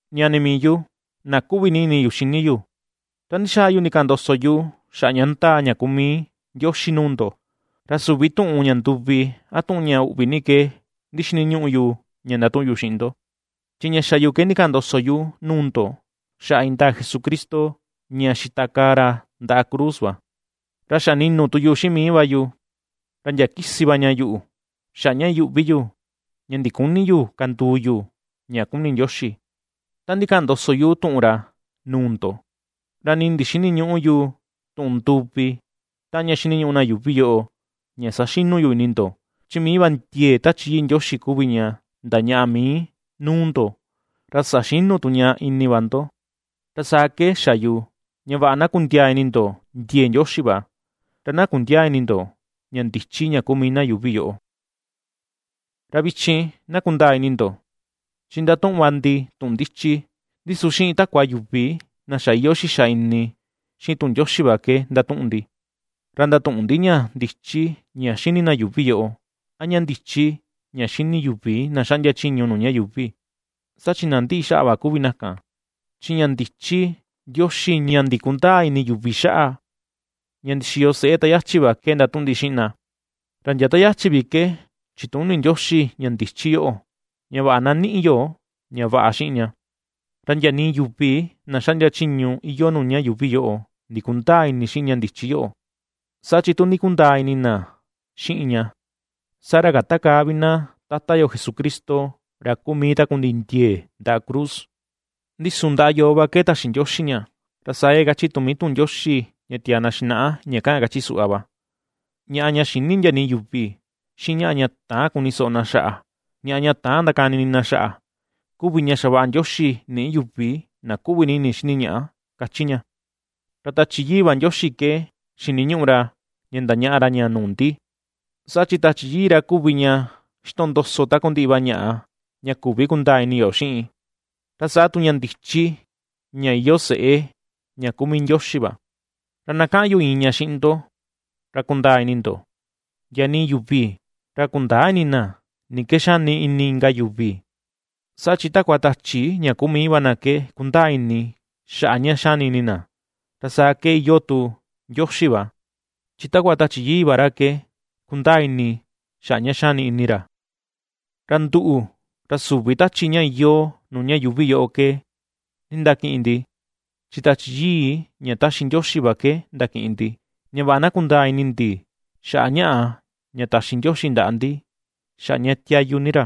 Ñani mii yu, na kuꞌvi ini yu xini yu, ta ndixaa yu ndikaꞌan ndoso yu xaꞌa ña ndaa, ña kuu mii Ndioxi nuu ndo, ra süvi tuꞌun ña nduvi a tuꞌun ña uꞌvi ni ke ndixiniñuꞌu yu ña ndatuꞌun yu xiꞌin ndo, chi ña xa yu ke ndikaꞌan ndoso yu nuu ndo xaꞌa indaa Jesucristo, ña xitakaa ra ndaꞌa cruz va. Ra xa ninu tu yu xiꞌin mii va yu, ra ndia kisi va ña yuꞌu xaꞌa ña iyuꞌvi yu, ña ndiküni yu kanduu yu ña kuni Ndioxi ta ndikaꞌan ndoso yu tuꞌun ra nuu ndo, ra nii ndixïniñuꞌu yu tuꞌun nduvi taꞌan ña ^xiniñuꞌu na yuuvi yoꞌo ña saxinu yu ini ndo. Chi mii va ndiee Tachi Yii Ndioxi kuvi ña ndañaꞌa mii nuu ndo, ra saxinu tu ña ini va ndo. Ra saa ke xa yu ña vaꞌa na kundiaa ini ndo ndiee Ndioxi va, ra na kundiäa ini ndo ña ndichi ña kuu mii na yuuvi yoꞌo. Ra vichin na kundaa ini ndo, chi ndatuꞌun va ndi tuꞌun ndichi, ndi su xiꞌin takua yuvi na xa iyoo xixa ini xiꞌin tuꞌun Ndioxi va ke ndatuꞌun ndi; ra ndatüꞌun ndi ña ndichi ña xini na yuuvi yoꞌo, a ña ndichi ña xini yuvi na xaꞌndia chiñu nuu ña yuuvi, saa chi na ^ndiꞌi xaꞌa va kuvi na kan. Chi ña ndichi Ndioxi ña ndikundäa ini yuvi xaꞌa, ña ndixiyo seꞌe ta yachi va ke ndatuꞌun ndi xiꞌin na; ra ndia ta yachi vi ke chituni Ndioxi ña ndichi yoꞌo, ña vaꞌa na niꞌi yo ña vaꞌa xiꞌin ña. Ra ndia nii yuvi na xaꞌndia chiñu iyoo nuu ña yuuvi yoꞌo ndikundäa ini xiꞌin ña ndichi yoꞌo, saa chi tu ndikundaa ini na xiꞌin ña, saa ra kätakaa vi na Tata yo Jesucristo ra kuu mii takundiꞌi ndiee ndaꞌa cruz. Ndi su ndaꞌa yoo va ke taxi Ndioxi ña, ra saa ke kachi tu mii tuꞌun Ndioxi ña tia̱à na xinaꞌa va: Ñaꞌa ña xïni ndia nii yuvi, xiꞌin ñaꞌa ña täan kuni soꞌo na xaꞌa, ñaꞌa ña täan ndakani ini na xaꞌa, kuvi ña xavaꞌa Ndioxi niꞌi yuvi na kuꞌvi ini xini ñaꞌa, kachi ña. Ra Tachi Yii va Ndioxi ke xiniñuꞌu ra ña ndañaꞌa ra ña nuu ndi, saa chi Tachi Yii ra kuvi ña xitondoso takundiꞌi va ñaꞌa ña küvi kundaa ini yo xiꞌin, ra saa tu ña ndichi ña iyoo seꞌe, ña kuu mii Ndioxi va. Ra na kaꞌan yu iin ña xiꞌin ndo ra kundaa ini ndo, ndia nii yuvi, ra kundäa ini na, ni ke xani ini inka yuvi, saa chi takua tachi ña kuu mii va na ke kundaa ini xaꞌa ña xani ini na. Ra saa ke iyoo tu Ndioxi va, chi takua Tachi Yii va ra ke kundaa ini xaꞌa ña xani ini ra. Ra nduꞌu, ra süvi tachi ña iyoo nuu ña yuuvi yoꞌo ke nindakiꞌin ndi, chi Tachi Yii ña taxi Ndioxi va ke ndakiꞌin ndi, ña vaꞌa na kundaa ini ndi xaꞌa ñaꞌa ña taxi Ndioxi ndaꞌa ndi, xaꞌa ña tiayu ni ra.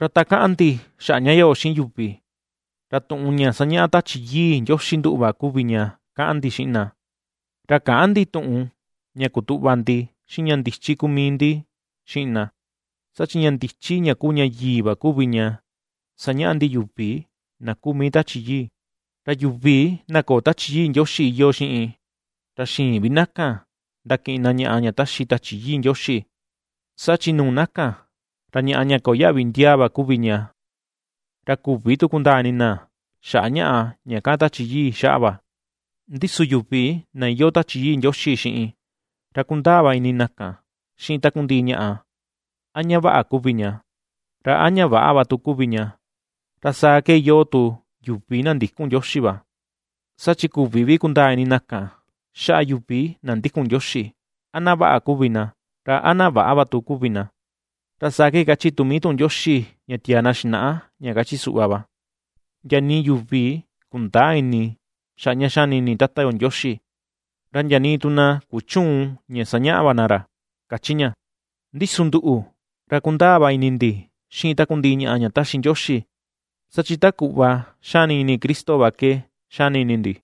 Ra ta kaꞌan ndi xaꞌa ña yoꞌo xiꞌin yuvi, ra tuꞌun ña sañaꞌa Tachi Yii Ndioxi nduꞌu va kuvi ña kaꞌan ndi xiꞌin na, ra käꞌan ndi tuꞌun ña kutuꞌva ndi xiꞌin ña ndichi kuu mii ndi xiꞌin na. Saa chi ña ndichi ña kuu ña yii va kuvi ña ^sañaꞌa ndi yuvi na kuu mii Tachi Yii. Ra yuvi na köo Tachi Yii Ndioxi iyoo xiꞌin, ra xïin vi na kan ndakiꞌin na ñaꞌa ña taxi Tachi Yii Ndioxi, saa chi nuu na kan, ra ñaꞌa ña köo yaꞌvi ndiaa va kuvi ña, ra küvi tu kundaa ini na xaꞌa ñaꞌa ña kaꞌan Tachi Yii xaꞌa va. Ndi su yuvi na iyoo Tachi Yii Ndioxi xiꞌin, ra kundaa va ini na kan xiꞌin takundiꞌi ñaꞌa a ña vaꞌa kuvi ña, ra a ña väꞌa va tu kuvi ña, ra saa ke iyoo tu yuvi na ndïkun Ndioxi va, saa chi küvi vi kundaa ini na kan xaꞌa yuvi na ndikun Ndioxi, a na vaꞌa kuvi na, ra a na väꞌa va tu kuvi na. Ra saa ke kachi tu mii tuꞌun Ndioxi ña tiaa na xinaꞌa ña kachi suꞌva va: “Ndia nii yuvi kundäa ini xaꞌa ña xani ini Tata yo Ndioxi, ra ndia nii tu na kuchüun ña sañaꞌa va na ra”, kachi ña. Ndi su nduꞌu, ra kundaa va ini ndi xiꞌin takundiꞌi ñaꞌa ña taxi Ndioxi, saa chi ta kuꞌva xani ini Cristo va ke xani ini ndi.